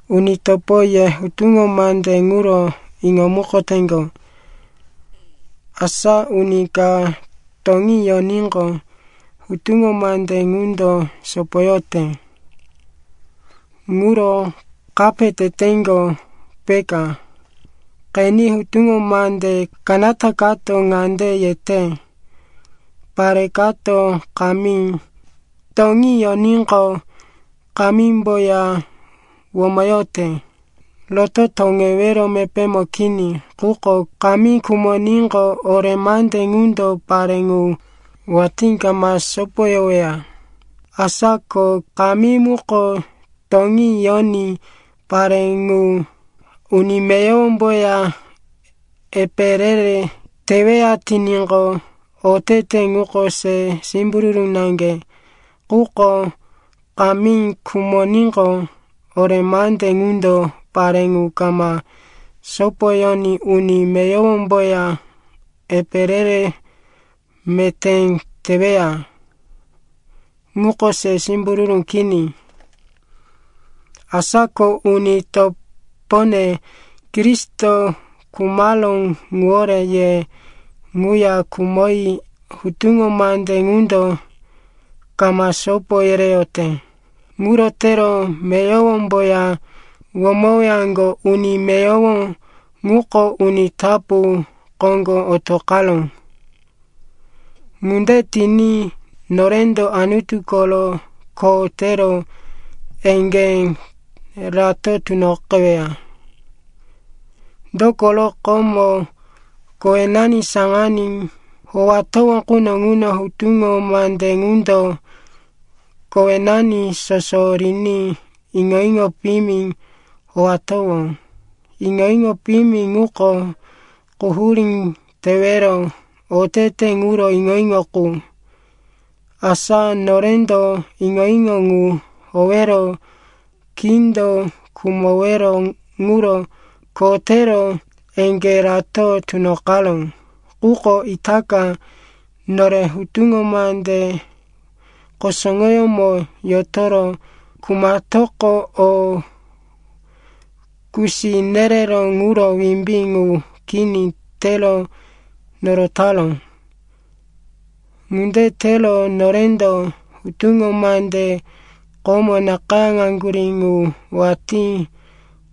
Uni topo, ye hutuŋo mande ŋuro iŋomukoteŋgo. Asa uni ka toŋí yoníqo, hutuŋo mande ŋundo sopoyote. Ŋuro kape teteŋgo, peka. Qeni, hutuŋo mande kanata kato ŋande yete, pare kato kamí, toŋí yoníqo kamímboya womoyote, roto toŋewero mepémo kini. Quko kamí khumoníqo, ore mande ŋundo pare ŋu watí kama sopoyoweya. Asa ko kamí muko toŋí yoní pare ŋu uni meyowomboya epe re-re teweya tiníqo, otete ŋuko se simbururu naŋge. Quko kamí khumoníqo, ore mande ŋundo pare ŋu kama sopoyoní uni meyowomboya epe re-re meté teweya. Ŋuko se simbururu kini. Asa ko, uni topone, Kristo khumaró ŋuwore ye ŋuya khumoyi hutuŋo mande ŋundo kama sopo yereyote. Ŋuro tero meyowomboya womowaŋgo. Uni meyowo ŋuko uni tapu koŋgo otoqaró. Ŋunde tiní norendo Anutu koro kho tero eŋgé rato tunoqeweya. Dokoro komo, kowenani saŋaní howatowó quno ŋuno, hutuŋo mande ŋundo kowenani soso riní iŋo-iŋo piyimi howatowó. Iŋo-iŋo piyimi ŋuko quhurí tewero otete ŋuro iŋo-iŋo qu. Asa norendo iŋo-iŋo ŋu howero kindo khumowero ŋuro kho tero eŋgé rato tunoqaró. Quko itaka, nore hutuŋo mande kusuŋoyómo yotoro khumatoqo, o kusi nereró ŋuro wimbí ŋu kini tero norotaró. Ŋunde tero norendo hutuŋo mande komo nakayáŋaŋgurí ŋu watí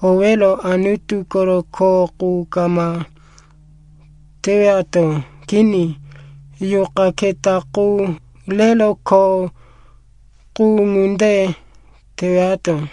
howero Anutu koro kho qu kama tewato. Kini, yuqa keta qu rero kho qu ŋunde tewato.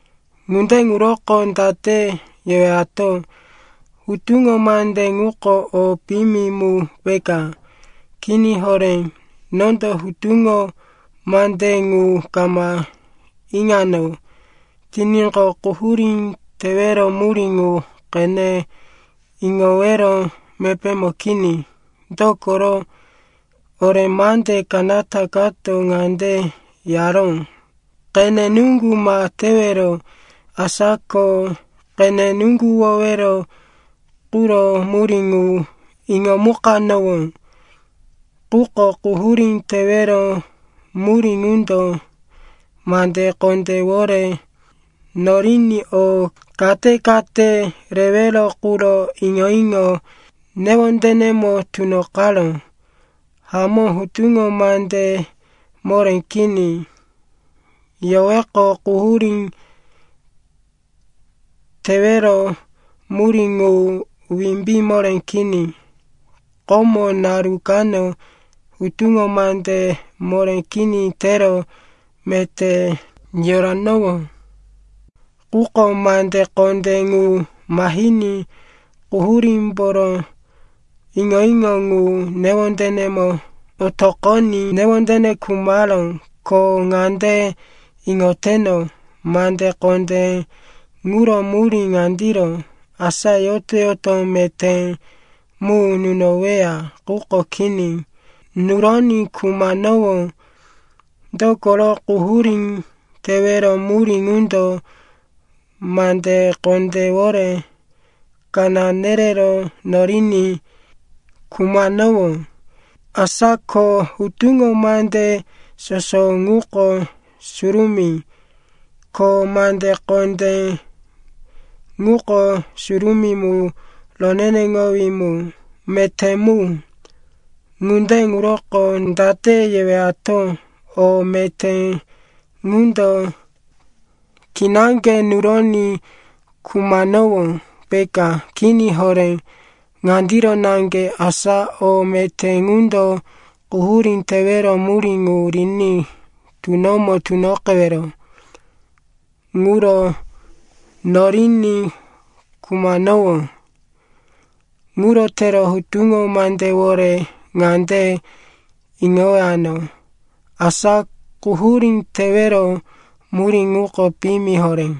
Ŋunde ŋuroko date yewato? Hutuŋo mande ŋuko o piyimi mu peka? Kini horé. Nondo hutuŋo mande ŋu kama iŋano tiníqo, quhurí tewero murí ŋu qene iŋowero mepémo kini. Dokoro ore mande kanata kato ŋande yaró, “Qene nuŋgu ma tewero,” asa ko qene nuŋguwowero quro murí ŋu iŋomukanowó. Quko quhurí tewero murí ŋundo mande kondéwore noriní o kate-kate rewero quro iŋo-iŋo newondenemo tunoqaró. Hamó, hutuŋo mande moré kini yoweqo, quhurí tewero murí ŋu wimbí moré kini. Komo naru kano hutuŋo mande moré kini tero meté yoranowó. Quko mande kondé ŋu mahiní quhurímboro iŋo-iŋo ŋu newondenemo otoqoní newondene khumaró. Ko ŋande iŋoteno, mande kondé ŋuro murí ŋandiro, asa yoto-yoto meté mu nunoweya. Quko kini, nuroní khumanowó. Dokoro quhurí tewero murí ŋundo mande kondéwore kaná nerero noriní khumanowó. Asa ko hutuŋo mande soso ŋuko surumí, ko mande kondé ŋuko surumí mu, roneneŋowí mu, meté mu. Ŋunde ŋuroko date yewato? O meté ŋundo kinaŋge nuroní khumanowó, peka? Kini horé. Ŋandiro naŋge, asa o meté ŋundo quhurí tewero murí ŋu riní tunomo tunoqewero ŋuro noriní khumanowó. Ŋuro tero hutuŋo mandewore ŋande iŋowano, asa quhurí tewero murí ŋuko piyimi horé.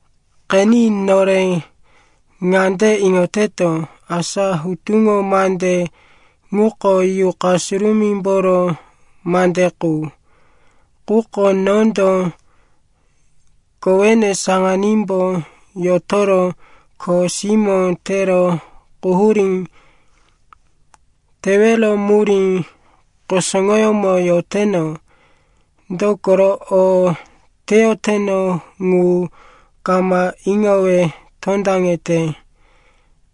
Qeni, nore ŋande iŋoteto, asa hutuŋo mande ŋuko Yuqa Surumímboro mande qu. Quko nondo kowene saŋanímbo yotoro kho simó tero quhurí tewero murí kusuŋoyómo yoteno. Dokoro o teyoteno ŋu kama iŋowe tondaŋete.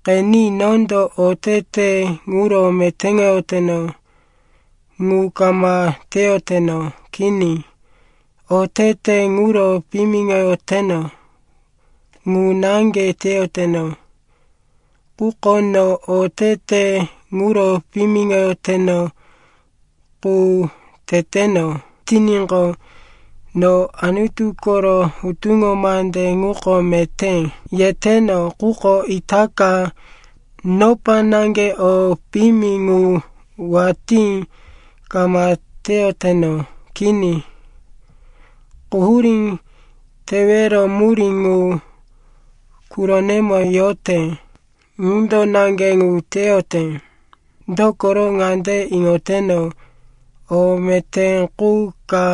Qeni, nondo otete ŋuro metéŋoyoteno ŋu kama teyoteno. Kini, otete ŋuro piyimiŋoyoteno ŋu naŋge teyoteno. Quko no otete ŋuro piyimiŋoyoteno qu teteno tiníqo, no Anutu koro hutuŋo mande ŋuko meté, yeteno. Quko itaka, nopa naŋge o piyimi ŋu watí kama teyoteno. Kini, quhurí tewero murí ŋu quronemo yote, ŋundo naŋge ŋu teyote. Dokoro ŋande iŋoteno, o meté qu ka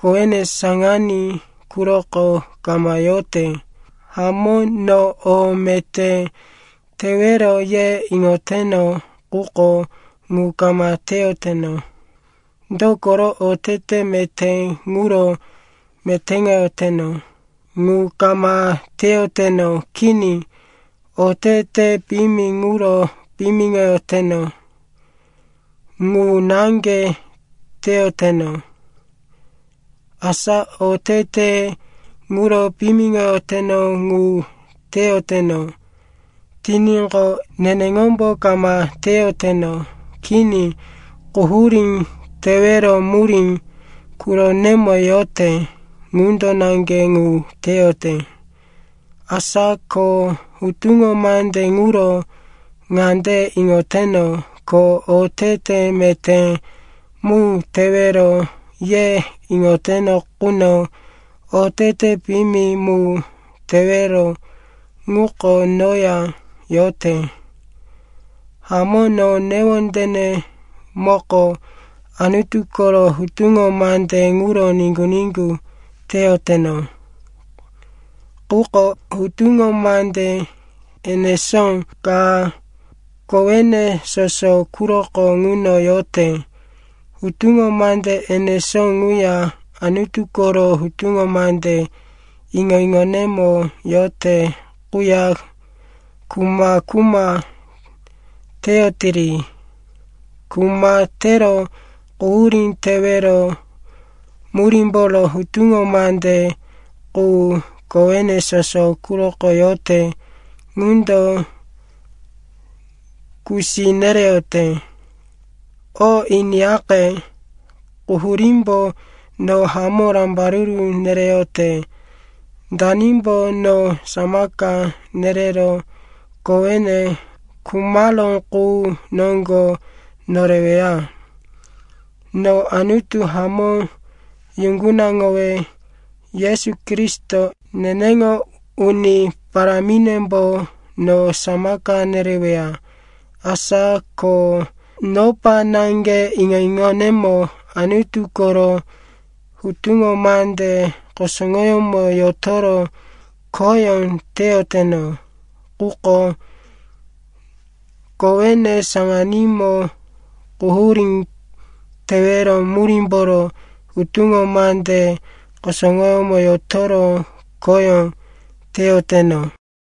kowene saŋaní quroko kama yorote. Hamó, no o meté tewero, ye iŋoteno, quko ŋu kama teyoteno. Dokoro otete meté ŋuro metéŋoyoteno ŋu kama teyoteno. Kini, otete piyimi ŋuro piyimiŋoyoteno ŋu naŋge teyoteno. Asa otete ŋuro piyimiŋoyoteno ŋu teyoteno tiníqo, neneŋombo kama teyoteno. Kini, quhurí tewero murí quronemo yote, ŋundo naŋge ŋu teyote. Asa ko hutuŋo mande ŋuro ŋande iŋoteno, ko otete meté mu tewero, ye iŋoteno quno, otete piyimi mu tewero ŋuko noya yote. Hamó, no newondenemoko Anutu koro hutuŋo mande ŋuro niŋgu-niŋgu teyoteno. Quko hutuŋo mande enesó ka kowene soso quroko ŋuno yote. Hutuŋo mande enesó ŋuya Anutu koro hutuŋo mande iŋo-iŋonemo yote quya kuma-kuma teyotiri. Kuma tero quhurí tewero murímboro hutuŋo mande qu kowene soso quroko yote ŋundo kusi nereyote. O iniyaqe, quhurímbo no hamó rambaruru nereyote! Danimbo no samaka nerero kowene khumaró qu noŋgo noreweya? No Anutu hamó yuŋgunaŋowe! Yesu Kristo, neneŋo Uni Paráminembo no samaka nereweya. Asa ko nopa naŋge iŋo-iŋonemo Anutu koro hutuŋo mande kusuŋoyómo yotoro khoyó teyoteno, quko kowene saŋanímo quhurí tewero murímboro hutuŋo mande kusuŋoyómo yotoro khoyó teyoteno.